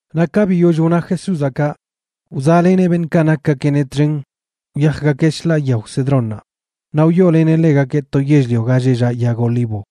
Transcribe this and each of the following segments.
Naꞌ ka biyoll wna Jesúzaꞌ kaꞌ, wzaꞌleneꞌ beṉꞌkaꞌ nakgakeꞌneꞌ txen wyajgakeꞌ shḻaa yao Cedrónnaꞌ, naꞌ wyooleneꞌ ḻegakeꞌ to yell-lio ga lleꞌ llaꞌ yag olivo.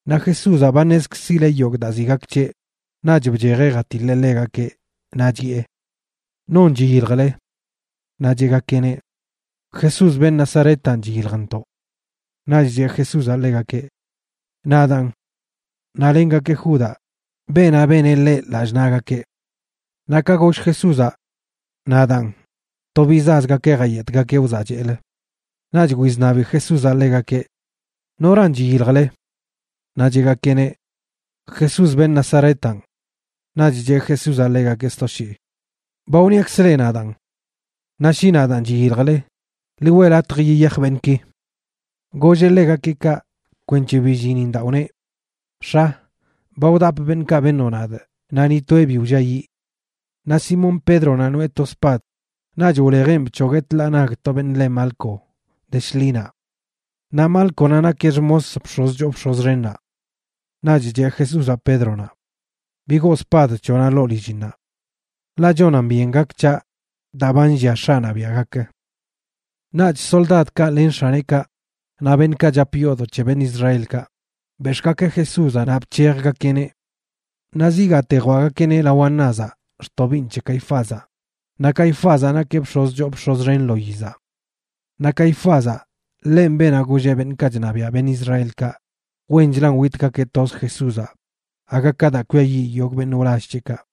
Naꞌ Jesúzaꞌ ba ṉezkzileꞌ yogꞌ daa ziꞌ gak c̱heꞌ, naꞌch bchejeꞌ jatiḻeꞌ ḻegakeꞌ, naꞌ chiꞌe: ―¿Non chiyiljle? Naꞌ cheꞌgakeꞌneꞌ: ―Jesús, beṉꞌ Nazaretanꞌ, chiyiljntoꞌ. Naꞌch cheꞌ Jesúzaꞌ ḻegakeꞌ: ―Nadaanꞌ. Naꞌ lengakeꞌ Judaꞌ, beenaꞌ beneꞌ ḻeꞌ lallꞌ naꞌgakeꞌ. Naꞌ ka goll Jesúzaꞌ: “Nadaan”, to bizaꞌzgakeꞌ jayetgakeꞌ wzaꞌcheꞌlə. Naꞌch wizṉabi Jesúzaꞌ ḻegakeꞌ: ―¿Noran chiyiljle? Naꞌ cheꞌgakeꞌneꞌ: ―Jesús, beṉꞌ Nazaretanꞌ. Naꞌch cheꞌ Jesúzaꞌ ḻegakeꞌ sto shii: ―Ba wniakzꞌ leꞌ nadaan. Naꞌ shi nadaan chiyiljle, ḻi weꞌ latj yiyaj beṉꞌki. Golleꞌ ḻegakeꞌ kaꞌ kwenc̱he billinin daa wneꞌ: “X̱a, ba wdapꞌ beṉꞌkaꞌ beṉoꞌ nadꞌ naꞌ ni toeꞌ bi wlliayiꞌ.” Naꞌ Simón Pédronaꞌ noꞌe to spad, naꞌch wlejeꞌn bc̱hogueꞌ tḻaa nag to beṉꞌ le Malco, de shḻinaꞌ. Naꞌ Málconaꞌ nakeꞌ xmos bx̱oz choo bx̱oz xennaꞌ. Naꞌch cheꞌ Jesúzaꞌ Pédronaꞌ: ―Bigoo spad c̱hoꞌnaꞌ ḻoo lillinnaꞌ. Ḻaꞌ chonan byen gak c̱haꞌ daa ba nllia X̱aꞌnaꞌ biaꞌ gak. Naꞌch soldadkaꞌ len x̱aneꞌkaꞌ, naꞌ beṉꞌkaꞌ chap yoodoꞌ c̱he beṉꞌ Israelkaꞌ, bex̱ꞌgakeꞌ Jesúzaꞌ naꞌ bc̱hejgakeꞌneꞌ. Naꞌ zigaate jwaꞌgakeꞌneꞌ lao Anázaꞌ xtobiiṉ c̱he Caifázaꞌ, naꞌ Caifázaꞌ nakeꞌ bx̱oz choo bx̱oz xen lo yizaꞌ. Naꞌ Caifázaꞌ, ḻenꞌ beenaꞌ golleꞌ beṉꞌkaꞌ chṉabiaꞌ beṉꞌ Israelkaꞌ wenchlan witgakeꞌ toz Jesúzaꞌ aga ka daa kwiayiꞌ yogꞌ beṉꞌ wlall c̱heꞌkaꞌ.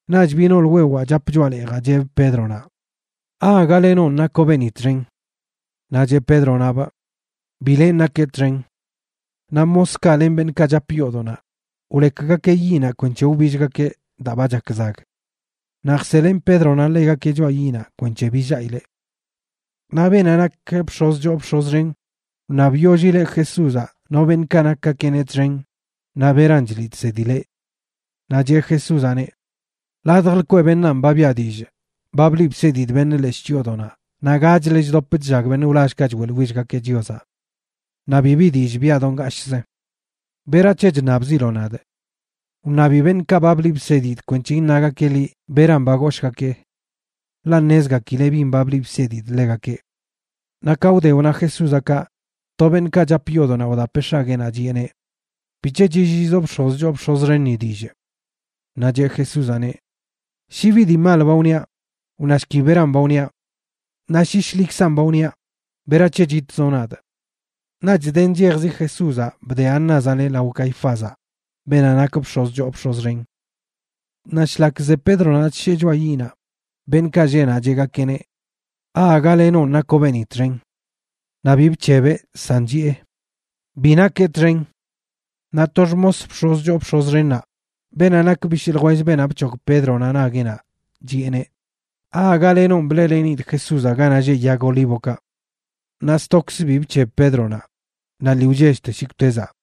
Naꞌch biꞌ nool wewaa chap choꞌa leejaꞌ cheꞌbꞌ Pédronaꞌ: ―¿Aaga lenonꞌ nakoꞌ beeni txen? Naꞌ cheꞌ Pédronaꞌbꞌ: ―Bi lenꞌ nakee txen. Naꞌ moskaꞌ len beṉꞌkaꞌ chap yoodoꞌnaꞌ wlekgakeꞌ yiꞌnaꞌ kwenc̱he wbillgakeꞌ daa ba chak zag. Naꞌ jselen Pédronaꞌ ḻegakeꞌ choꞌa yiꞌnaꞌ kwenc̱he billaꞌileꞌ. Naꞌ beenaꞌ nak bx̱oz choo bx̱oz xen wṉabyollileꞌ Jesúzaꞌ no beṉꞌkaꞌ nakgakeꞌneꞌ txen naꞌ beran chliꞌ chsedileꞌ. Naꞌ cheꞌ Jesúzaꞌneꞌ: ―Ladj lkweꞌ beṉaan ba biꞌa dillꞌ. Ba bliꞌ bsedidꞌ beṉꞌ leshꞌ chyoodoꞌnaꞌ naꞌ gachlə chdop chllag beṉꞌ wlallkaꞌ choeꞌḻwillgakeꞌ Chiozaꞌ. Naꞌ bibi dillꞌ biꞌa do ngashꞌzə. ¿Berac̱he chṉabziloꞌ nadꞌ? Wṉabi beṉꞌkaꞌ ba bliꞌ bsedidꞌ kwenc̱he iṉagakeꞌ liꞌ beran ba goshgakee. Ḻaꞌ ṉezgakileꞌ bin ba bliꞌ bsedidꞌ ḻegakeꞌ. Naꞌ ka wde wna Jesúzaꞌ kaꞌ, to beṉꞌkaꞌ chap yoodoꞌnaꞌ wdapeꞌ x̱agueenaꞌ, chiꞌeneꞌ: ―¿Bic̱he chilliizoꞌ bx̱oz choo bx̱oz xenni dillꞌ? Naꞌ cheꞌ Jesúzaꞌneꞌ: ―Shi bi dii mal ba wniaꞌ, wnashki beran ba wniaꞌ. Naꞌ shi shḻikzan ba wniaꞌ, ¿berac̱he chitzoꞌ nadꞌ? Naꞌch de nchejzi Jesúzaꞌ bde Anázaꞌneꞌ lao Caifázaꞌ, beenaꞌ nak bx̱oz choo bx̱oz xen. Naꞌ shlak ze Pédronaꞌ chshee choꞌa yiꞌnaꞌ, beṉꞌkaꞌ lleꞌ naꞌ cheꞌgakeꞌneꞌ: ―¿Aaga lenonꞌ nakoꞌ beeni txen? Naꞌ bi bc̱hebeꞌ, san chiꞌe: ―Bi nakee txen. Naꞌ to xmos bx̱oz choo bx̱oz xennaꞌ, beenaꞌ nak bishꞌ ljwell beenaꞌ bc̱hog Pédronaꞌ nagueꞌnaꞌ, chiꞌeneꞌ: ―¿Aaga lenonꞌ bleꞌlenidꞌ Jesúzaꞌ ganaꞌ lleꞌ yag olívokaꞌ? Naꞌ stokzə bi bc̱heb Pédronaꞌ, naꞌ lii wchellte shikwtezaꞌ.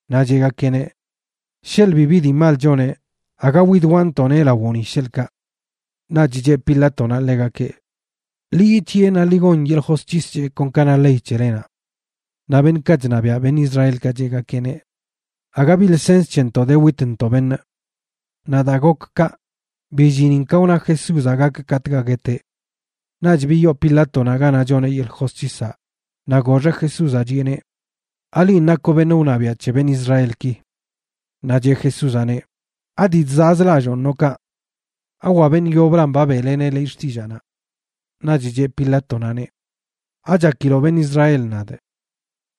Naꞌ cheꞌgakeꞌneꞌ: ―Sheḻꞌ bibi dii mal choneꞌ aga widwaꞌntoꞌneꞌ lawoꞌ ni, sheḻꞌkaꞌ. Naꞌch cheꞌ Pilátonaꞌ ḻegakeꞌ: ―Ḻi yic̱hiꞌe naꞌ ḻi gon yeḻꞌ josc̱his c̱heꞌ kon ka na ley c̱helenaꞌ. Naꞌ beṉꞌkaꞌ chṉabiaꞌ beṉꞌ Israelkaꞌ cheꞌgakeꞌneꞌ: ―Aga bi lsens c̱hentoꞌ de witntoꞌ beṉꞌ. Naꞌ daa gok kaꞌ, billinin ka wna Jesúzaꞌ gak katꞌkaꞌ gueteꞌ. Naꞌch biyoo Pilátonaꞌ ganaꞌ choneꞌ yeḻꞌ josc̱hisaꞌ, naꞌ goxeꞌ Jesúzaꞌ chiꞌeneꞌ: ―¿Alinꞌ nakoꞌ beṉꞌ wṉabiaꞌ c̱he beṉꞌ Israelki? Naꞌ cheꞌ Jesúzaꞌneꞌ: ―¿Adii chzaꞌz lalloon noꞌ kaꞌ? ¿Awa beṉꞌ yoblan ba beꞌleneꞌ liꞌ xtillaanaꞌ? Naꞌch cheꞌ Pilátonaꞌneꞌ: ―¿Achakiloꞌ beṉꞌ Israel nadꞌ?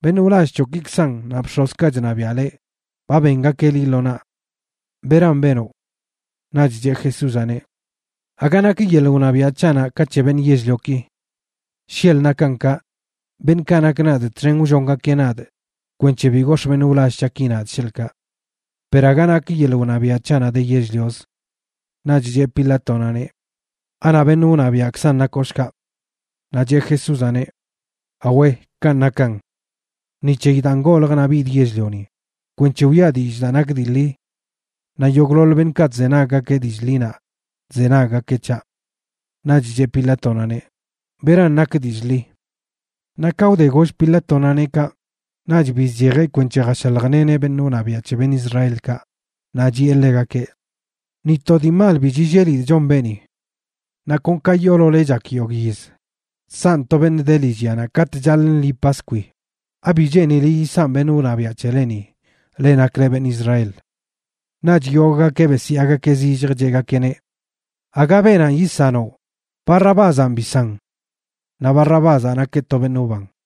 Beṉꞌ wlall c̱hoꞌkikzan naꞌ bx̱ozkaꞌ chṉabiaꞌ leꞌ, ba bengakeꞌ liꞌ lo naꞌ. ¿Beran benoꞌ? Naꞌch cheꞌ Jesúzaꞌneꞌ: ―Aga nak yeḻꞌ wṉabiaꞌ c̱haꞌnaꞌ ka c̱he beṉꞌ yell-lioki. Sheḻꞌ nakan kaꞌ, beṉꞌkaꞌ nak nadꞌ txen wllongakeꞌ nadꞌ kwenc̱he bi gox̱ꞌ beṉꞌ wlall c̱haꞌki nadꞌ, sheḻꞌkaꞌ. Per aga nak yeḻꞌ wṉabiaꞌ c̱haꞌnaꞌ de yell-lioz. Naꞌch cheꞌ Pilátonaꞌneꞌ: ―¿Anaꞌ beṉꞌ wṉabiaꞌkzan nakoꞌ, shkaꞌ? Naꞌ cheꞌ Jesúzaꞌneꞌ: ―Awe, kanꞌ nakan. Ni c̱heyi daan goljꞌ naꞌ bidꞌ yell-lioni, kwenc̱he wiꞌa dillꞌ daa nak dii ḻi. Naꞌ yogꞌḻoḻ beṉꞌkaꞌ chzenaggakeꞌ dillꞌ ḻinaꞌ, chzenaggakeꞌ c̱haꞌ. Naꞌch cheꞌ Pilátonaꞌneꞌ: ―¿Beran nak dillꞌ ḻi? Bc̱hoglogakeꞌ guet Jesúzaꞌ Naꞌ ka wde goll Pilátonaꞌneꞌ kaꞌ, naꞌch bizchejeꞌ kwenc̱he jashaljleneꞌ beṉꞌ wṉabiaꞌ c̱he beṉꞌ Israelkaꞌ, naꞌ chiꞌe ḻegakeꞌ: ―Ni to dii mal bi chillelidꞌ chon beeni. Naꞌ kon ka yoolole chak yogꞌ yiz chsanꞌ to beṉꞌ de lillyanaꞌ katꞌ chaḻꞌ lṉi Paskwi, ¿abi cheenile yisanꞌ beṉꞌ wṉabiaꞌ c̱heleni, leꞌ nakle beṉꞌ Israel? Naꞌch yogꞌgakeꞌ besyaagakeꞌ zillj, cheꞌgakeꞌneꞌ: ―¡Aga beenanꞌ yisanoꞌ! ¡Barrabázanꞌ bisan! Naꞌ Barrabázaꞌ nakeꞌ to beṉꞌ wban.